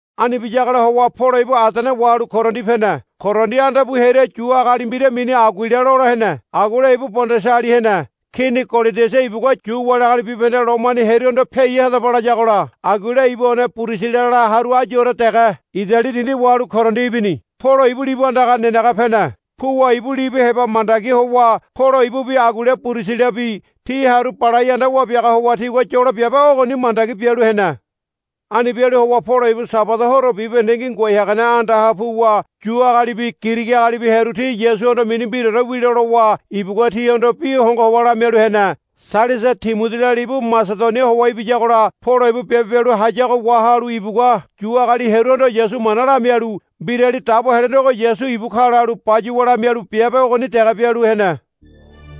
Ani biyagola howa Polo ibu Adene wahalu Korindi pene. Korindi anda pu hearia Yu agali mbira mini Aguila lola hene. Aguila ibu Pondasali hene. Kini Kolodiasa ibugua Yu wali agali bibahende Lomoni hearuhondo, Piai hadaba, layagola Aguila ibu one Pirisilala haru ayure dege Idali dindi wahalu Korindi ibini. Polo ibu libu andaga nenege pene. Puwa ibu libu heba mandagi howa Polo ibubi Aguila Pirisilabi ti haru balai anda wabiaga howa tigua yolo biabe ogoni mandagi bialu hene. Ani bialu howa Polo ibu Sabada horo bibahendengi ngoai hagane andaha puwa Yu agalibi Girigi agalibi hearu ti Yasuhondo mini mbiraore wilo lowa ibugua tihondo bi hongo howa lamialu hene. Sailasa Timodila libu Masedonia howa ibiyagola Polo ibu biabe bialu hayago wahalu ibugua Yu agali hearuhondo Yasu mana lamialu, Mbirali Dabo Helenego Yasu ibu ka, lalu bayuwa lamialu biabe ogoni dege bialu hene.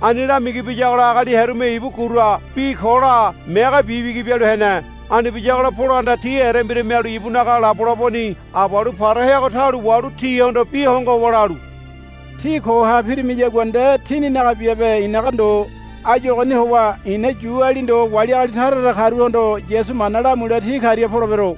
Ani lamigi biyagola agali hearume ibu gura bi ko la megebi bigi bialu hene. Ani biyagola Polohanda ti erembira mialu ibunaga labolaboni abalu para heago taulo wahalu tihondo bi hongo howa lalu, Tí koha pirimiyagua nde tíninaga biabe i̱naga ndo. Áyu ogoni howa i̱na Yuali ndo wali agali tara tara karuhondo Yasu mana lamule ti karia polebero,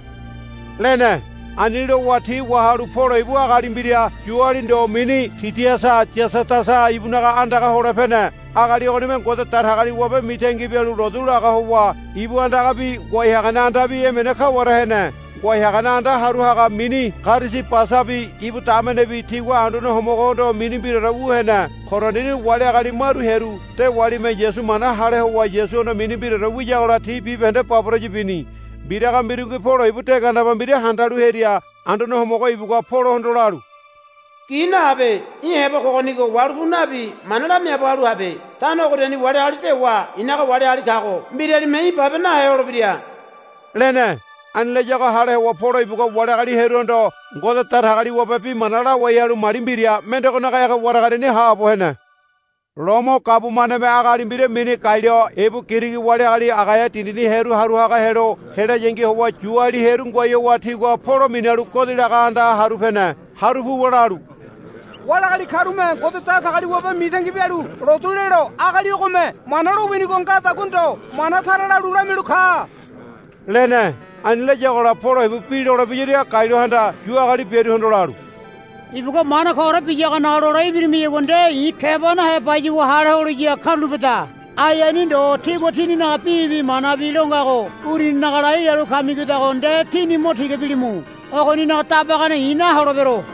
lene. Ani lowa ti wahalu Polo ibu agali mbira Yuali ndo mini Tidiasa Yasadasa ibunaga andaga hole pene. Agali ogonime Ngode Datagaliwabe mitangi bialu lotu laga howa ibu andagabi ngoai hagane andabi emene kaware hene. Ngoai hagane anda haru haga mini Karisibasabi ibu damenebi tigua Anduane Homogohondo mini mbiraore wu hene. Korindini wali agali maru hearu dewalime Yasu mana hale howa Yasuhondo mini mbiraore wiyagola ti bibahende baboraya bini. Mbiraga mbirungi Polo ibu de gandeba mbira handalu hearia Anduane Homogo ibugua Polohondo lalu. Gi nahabe. Í̠ heba kogonigo wahalu pu nabi mana lamiaabo halu habe. Tano ogoriani wali agali dewa i̱naga wali agali kago mbiralime í̠ babe nahe holebira, lene. Ani layago hale howa Polo ibugua wali agali hearuhondo Ngode Datagaliwabe bi mana lawai halu mali mbira mendegonaga ege waragariani haabo hene. Lomo gabumaneme agali mbira mini Galio ibu Girigi wali agali Agaia dindini hearu haru haga helo helayangi howa Yuali hearu ngoai howa tigua Polo minalu godi laga andaha haru pene. Haru puwa lalu, Wali agali karume Ngode Datagaliwabe mitangi bialu lotu lelo agali ogome mana lowinigo ngadagua ndo mana tara lalu lamialu ka, lene. Ani layagola Polo ibu bi lolebiyaria Galiohanda Yu agali biaruhondo lalu, Ibugua mana koore biyagonaga lole ibirimiyagua nde i̱ keba nahe bayuwa hale holiya karulapeda. Ai ani ndo tígua tíninaga bibi manabi lo ngago uruninaga lai lalu kamigodago nde tíni mo tiga bilimu. Ogoninaga dabagane i̱ naholebero,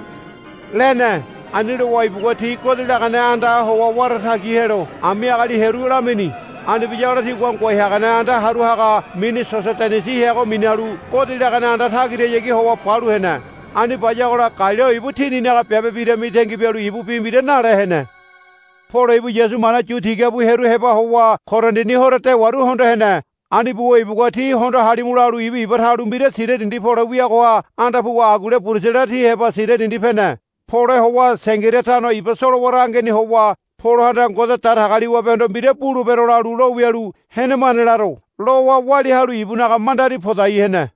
lene. Ani lowa ibugua ti godi lagane andaha howa wara tagi helo ami agali hearu lamini. Ani biyagola tigua ngoai hagane anda haru haga mini Sosodenisi heago minalu godi lagane anda tagirahayagi howa balu hene. Ani bayagola Galio ibu tininaga biabe bira mitangi bialu ibu bi mbira nale hene. Polo ibu Yasu mana yu tiga bu hearu heba howa Korindini horo dewaru hondo hene. Ani buwa ibugua, Tí hondo halimu, lalu iba talu mbira Siria dindi pole wiagoha anda puwa Aguila Pirisilabi ti heba Siria dindi pene. Pole howa Sengiria tano iba solowara angeni howa Polohanda Ngode Datagaliwabehondo, Mbira bulebero, lalu lo wialu, Henemane laro, lowa walia halu ibunaga mandari podai hene.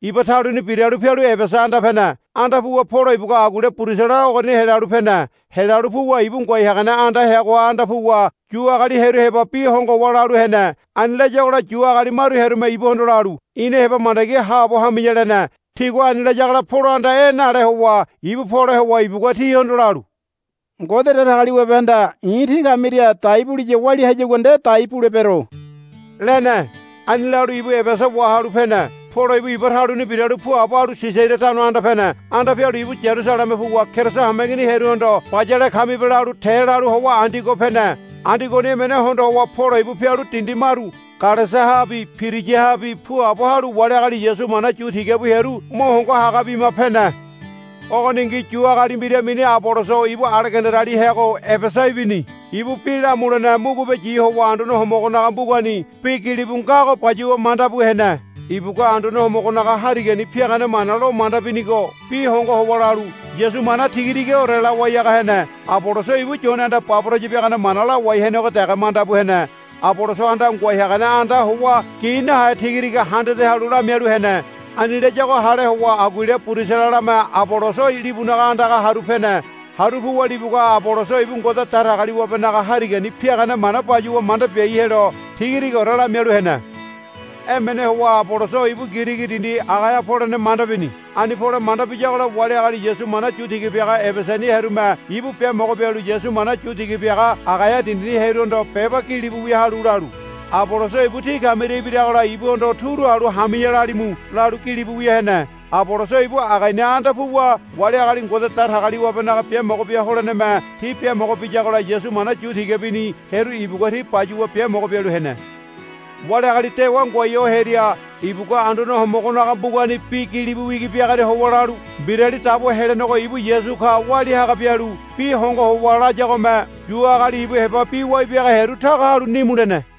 Iba taluni biralu pialu Ebesa anda pene. Anda puwa Polo ibugua Aguila Pirisilabi ogoriani helalu pene. Helalu puwa ibu ngoai hagane anda heagoha anda puwa Yu agali hearu heba bi hongo howa lalu hene. Ani layagola Yu agali maru hearume ibuhondo lalu, Ina heba mandagi haabo hami̱ya, lene. Tigua ani layagola Polohanda, E̱, nale howa ibu pole howa ibugua tihondo lalu, Ngode Datagaliwabehanda i̱ tí kamiria dai buliya walia hayagua nde dai bulebero, lene. Ani lalu ibu Ebesa wahalu pene. Polo ibu iba taluni biralu puabo halu Sisaria tano anda pene. Anda pialu ibu Yarusaleme puwa Keriso hameigini hearuhondo, Bayale kamibe, lalu te lalu howa Andiogo pene. Andiogoni emene hondo howa Polo ibu pialu dindi maru Galesiahabi Piriyahabi puabo halu wali agali Yasu mana yu tiga bu hearu mo hongo haga bima pene. Ogoningi Yu agali mbira mini Aboloso ibu Alegandariali heago Ebesa ibini. Ibu bi lamulene mugubeyi howa Anduane Homogonaga mbugani bi gilibu ngago bayuwa manda bu hene. Ibugua Anduane Homogonaga Harigani piagane mana lo manda binigo bi hongo howa lalu Yasu mana tiga tigaore lawai haga hene. Aboloso ibu Yonehanda baboraya biagane mana biawai henego dege manda bu hene. Abolosohanda ngoai hagane andaha howa gi nahe tigatiga handade halu lamialu hene. Ani layago hale howa Aguila Pirisilame Aboloso libunaga andaga haru pene. Haru puwa libugua Aboloso ibu Ngode Datagaliwabenaga Harigani piagane mana bayuwa manda biai helo tigatigaore lamialu hene. Emene howa Aboloso ibu Girigi dindi Agaia polene manda bini. Ani pole manda biyagola wali agali Yasu mana yu tiga biaga Ebesani hearume ibu biamogo bialu Yasu mana yu tiga biaga Agaia dindini hearuhondo beba gilibu wia halu lalu, Aboloso ibu tí kamiria ibiragola ibuhondo turu halu, Hami̱ya, lalimu, lalu gilibu wia hene. Aboloso ibu Agaiani anda puwa wali agali Ngode Datagaliwabenaga biamogo bia holeneme ti biamogo biyagola Yasu mana yu tiga bini hearu ibugua ti bayuwa biamogo bialu hene. Wali agali dewa ngoai ho hearia ibugua Anduane Homogonaga mbugani bi gilibu wigi biagoria howa lalu Mbirali Dabo Helenego ibu Yasu ka walia haga bialu bi hongo howa layagome Yu agali ibu heba bi wai biaga hearu taga halu nimu lene.